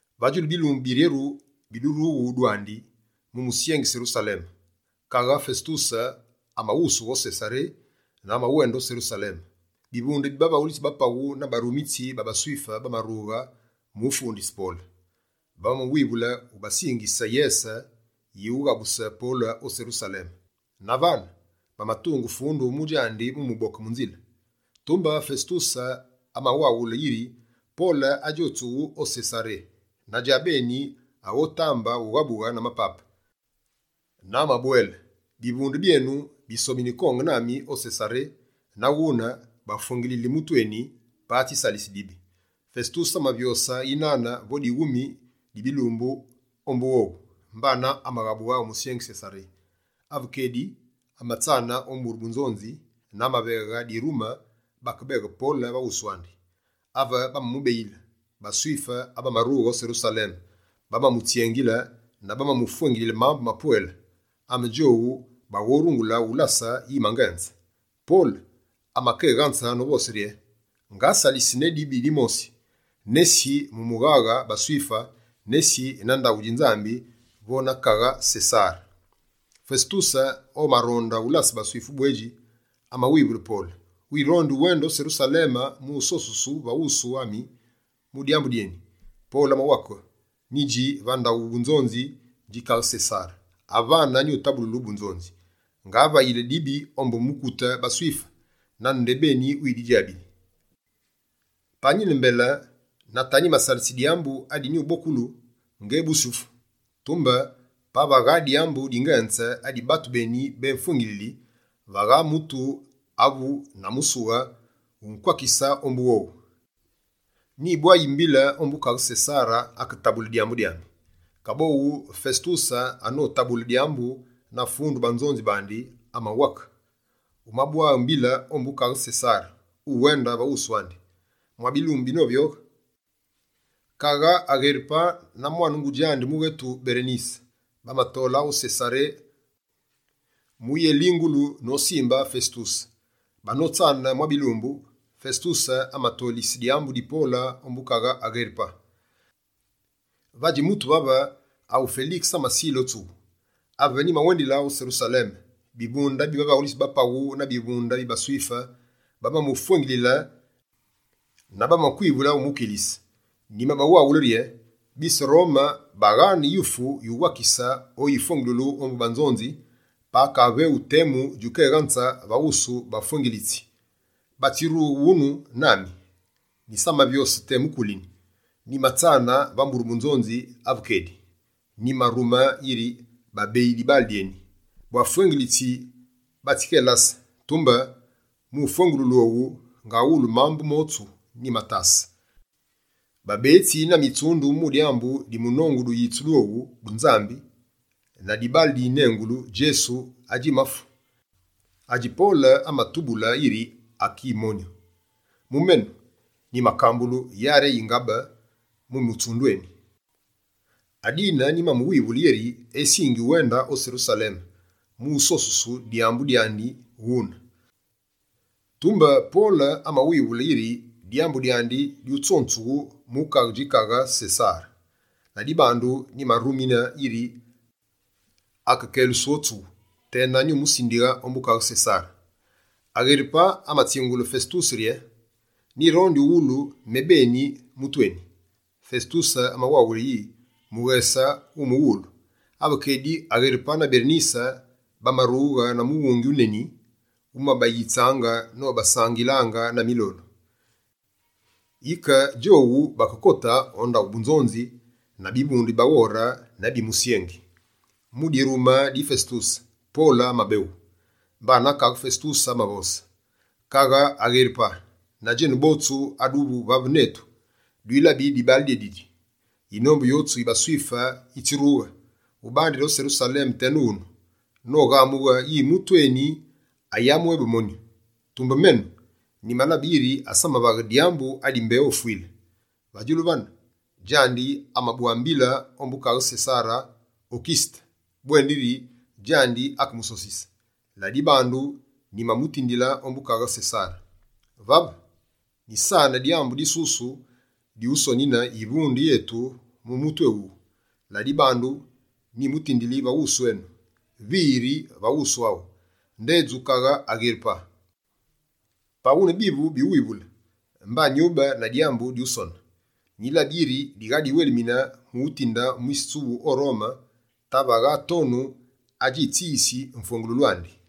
Va djulu bilumbu biryeru bi durughu dwandi mu musyengi Serusaleme, kaghe Fesetuse amaghusughe o Sesaré na amawende o Serusaleme. Bivunde bi bavaghulitsi ba paghu na barumitsi ba baSwife bamarughe mu ufundise Pole. Bamamuwivule ubasingise yese yi ughabuse Pole o Serusaleme. Na vane, bamatunge fundu mu djandi mu muboke mu nzile. Tumbe Fesetuse amawaghule yiri Pole adji o tsughu o Sesaré, na djabeni aghotambe ughabughe na mapape. Na amabwele: «Bivunde byenu bisobini konge nami o Sesaré na ghune bafwengilili mutu eni, pa atsisalise dibi.» Fesetuse amavyose yinane vo dighumi di bilumbu ombu wowu, mbana amaghabughe o musyengi Sesaré. Ave kedi, amatsane o mbure bunzonzi na amaveghe dirume bakebeghe Pole va wusu andi. Ave bamamubeyile, baSwife abamarughe o Serusaleme bamamutsyengile na bamamufwengilile mambu mapwele, ame djowu baghorungule ulase yi mangenze. Pole amakéghanze novose rye: «Ngasalise ne dibi dimosi: nesi mu mughaghe baSwife, nesi na ndaghu dji Nzambi, vo na kaghe Sesare.» Fesetuse, omaronde ulase baSwife ubwedji, amawivule Pole: «Wirondi uwende o Serusaleme mu usosusu va wusu ami mu dyambu dyeni?» Pole amawake: «Nyidji va ndaghu bunzonzi dji kaghe Sesare, avane nyutabululu bunzonzi. Ngavayile dibi ombu mukute baSwife, nane ndebeni wididjabili. Pa nine mbele na ta nyimasalise dyambu adi nyubokulu, ngébusi ufu. Tumbe pa vagha dyambu di ngenze adi batu beni bémfwengilili, vagha mutu avu na musughe wu ukwakise ombu owu. Nyibwayi mbile ombu kaghe Sesare aketabule dyambu dyami.» Kaboghu Fesetuse, anotabule dyambu na fundu banzonzi bandi, amawake: «Wumabwa mbile ombu kaghe Sesare, uwende va wusu andi.» Mwa bilumbu binovyoghe, kaghe Agheripa na, mwane ngudji andi mughetu Berenise, bamatole o Sesaré mu uyélingulu noyisimbe Fesetuse. Banotsane mwa bilumbu, Fesetuse amatolise dyambu di Pole ombu kaghe Agheripa: «Vadji mutu vave awu Felikese amasile o tsughu. Ave nyimawendile o Serusaleme, bivunde bi bavaghulitsi ba paghu na bivunde bi baSwife, bamamufwengilile na bamankwivule umukilise. Nyimabawaghule rye: “Bise Rome baghane yufu yuwakise oyifwengululu ombu banzonzi, pa akaveghu temu djukéghanze va wusu bafwengilitsi.” Batsirughe ghunu nami. Nyisamavyose temu kulini, nyimatsane va mbure bunzonzi, ave kedi, nyimarume yiri babeyi dibaale dyeni. Bafwengilitsi batsikélase, tumbe mu fwengululu owu, ngawulu mabi motsu nyimatase. Babetsi na mitsundu mu dyambu di munongu duyitsu doghu du Nzambi na dibaale dinengulu Djesu adjimafu, adji Pole amatubule yiri aki monyu. Mu menu, nyimakambulu yari ayi ngabe mu mutsundu eni. Adine nyimamuwivule yeri esingi uwende o Serusaleme, mu usosise dyambu dyandi ghune. Tumbe Pole amawivule, yiri dyambu dyandi dyutsonzughu mu kake dji kaghe Sesare. Ladibandu, nyimarumine yiri akekelusu o tsughu, tena nyumusindighe ombu kaghe Sesare.» Agheripa amatsingule Fesetuse rye: «Nyirondi uwulu mebeni mutu eni.» Fesetuse amawaghule yi: «Mughese wumuwulu.» Ave kedi, Agheripa na Berenise bamarughe na mughungi wuneni wumabayitsaange nobasangile na milolu. Yike djowu, bakekote o ndaghu bunzonzi na bivunde bi baghore na bi musyengi. Mu dirume di Fesetuse, Pole amabeghu. Mbana kaghe Fesetuse amavose: «Kaghe Agheripa, na djenu botsu aduvu vave netu, dwilabi dibaale dyédidi. Yinombu yotsu yi baSwife yi tsirughe, ubandile o Serusaleme tena ghunu, noghamughe yi mutu eni ayamwébe monyu. Tumbe menu, nyimalabe yiri asamavaghe dyambu adi mbé ofwile. Va djulu vane, djandi amabwa mbile ombu kaghe Sesare Okisete bwendiri djandi akemusosise. Ladibandu, nyimamutindile ombu kaghe Sesare. Vave, nyisane dyambu disusu dyusonine yivunde yetu mu mutu éwuwu. Ladibandu, nyimutindili va wusu enu, viri va wusu aghu, ndedju kaghe Agheripa. Pa wune bivu byumuwivule, mba nyube na dyambu dyusone. Nyilabi yiri digha diwelimine mu utinde mwise tsughu o Rome, ta vagha tonu adjitsiyisi mfwengululu andi.»